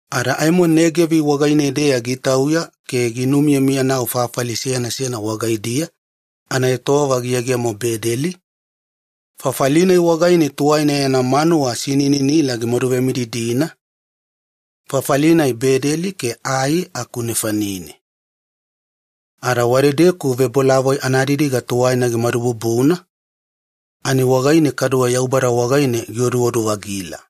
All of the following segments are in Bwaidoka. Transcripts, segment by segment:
Ada aimo Negevi wagaine-deya gitauya ke ginumiyamiyanau fafali seyana seyana wagaidiya anaetowava giyegemona Bedeli, fafali-nai wagaine tuwaina yana manuwa sinininila gimaduvemididina, fafali-nai Bedeli ke Ai aku nefanine. Ada wadedeku ebavebolavoi anadidiga tuwaina gimadububuna ani wagaine kaduwe Yaubada wagaine gioduodu-vagila.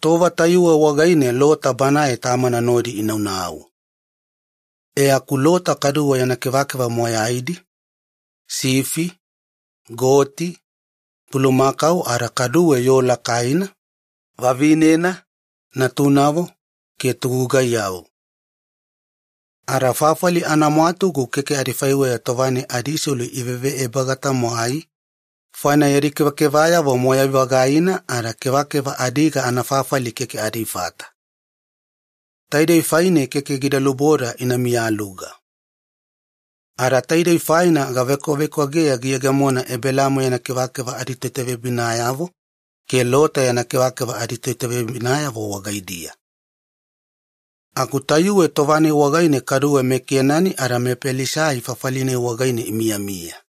Tova tayuwe wagaine Lota banae tamana nodi inunudadana. E aku Lota kaduwe yana kevakeva moyaidi, sifi, goti, bulumakau ada kaduwe yoo lakaina, vavinena, natunavo ke togugaiyavo. Ada fafali anamwatugu keke adifaiweya tova-nai adiselu iveve ebaga tamwai, faina yadi kevakevayavo moyai-vagaina ada kevakeva adiga anafafali keke adifata. Taidei faine keke gida luboda ina miyaluga. Ada taidei faina gavekwavekwageya giyegemona Ebelamo yana kevakeva aditoitaveyabinayavo ke Lota yana kevakeva aditoitaveyabinayavo wagaidiya. Aku tayuwe tova-nai wagaine kaduwe meKenani ada mePelisaiti fafali-nai wagaine imiyamiya.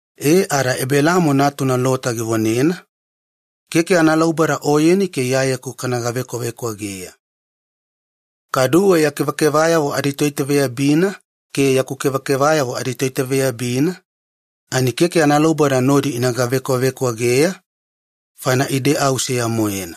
Ada tova-nai Ebelamo gikaiyanogala e ada natuna Lota givonena, “Keke analauboda oyeni ke iyayeku kana gavekwavekwageya. Kaduwe ya kevakevayavo aditoitaveyabina ke yaku kevakevayavo aditoitaveyabina keke analauboda nodi ina gavekwavekwageya, faina ide au seya-moena.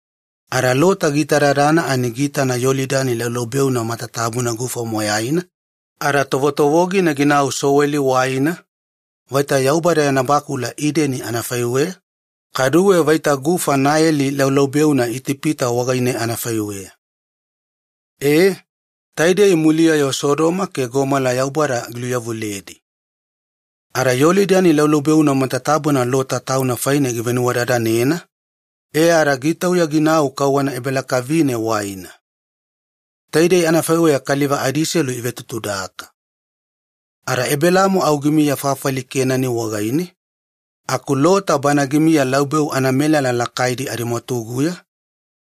Ada Lota giitadadana ani giitana Yolidani laubeuna matatabuna gufa moyaina ada tovotovogina ginau Sowa waina, vaita Yaubada yana bakula Ideni anafaiweya, kaduwe vaita gufa Naeli laubeuna Itipita wagaine anafaiweya. Taidei muliya-yo Sodoma ke Gomola Yaubada giluveyawaliyedi. Ada Yolidani laubeuna matatabuna Lota tauna faine givenuwadadanena e ada gitauya ginau kauwana ebalakavine waina. Taidei anafaiweya kaliva adiselu ivetutudaka. Ada Ebelamo au gimiya fafali Kenani wagaine, aku Lota bana gimiya laubeu anamelala lakaidi adimwatuguya,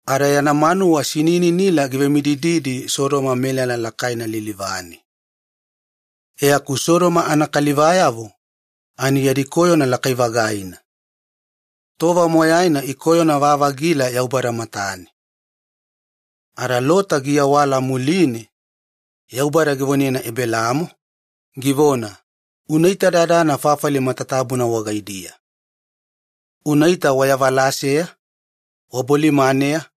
ada yana manuwa sinininila givemidididi Sodoma melala lakaina lilivane. E aku Sodoma anakalivayavo yadi koyona lakai-vagaina ada tova moyaina ikoyona-vavagila Yaubada matane. Ada Lota giawala muline, Yaubada givonena Ebelamo, givona, “Unaitadadana fafali matatabuna wagaidiya. Unaita wayavalaseya, wabolimaneya,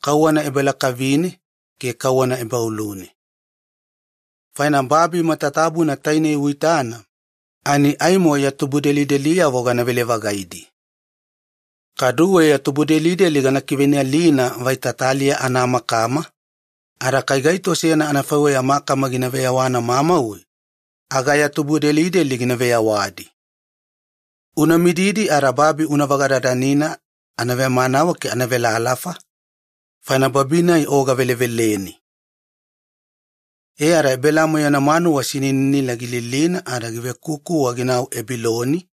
kauwana ebalakavine ke kauwana ebaolune. Faina babi matatabuna tainei uitana aimo ya tubudelideliyavo ganavele-vagaidi. Kaduwe ya tubudelideli gana kiveinalina vaita taliya anamakama, ada kai gaito seyana anafaiweya makama gina veyawana mamauwe aga ya tubudelideli gina veyawadi. Una mididi ada babi una vagadadanina anavemanawe ke anavelalafa, faina babi-nai o gaveleveleni.” E ada Ebelamo yana manuwa sinininila gililina ada givekukuwa ginau Ebiloni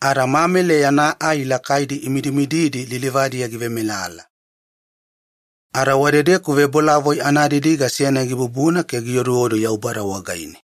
ada Mamili yana ai lakaidi imidimididi lilivadiya givemelala. Ada wadedeku ebavebolavoi anadidiga seyana gibubuna ke gioduodu Yaubada wagaine.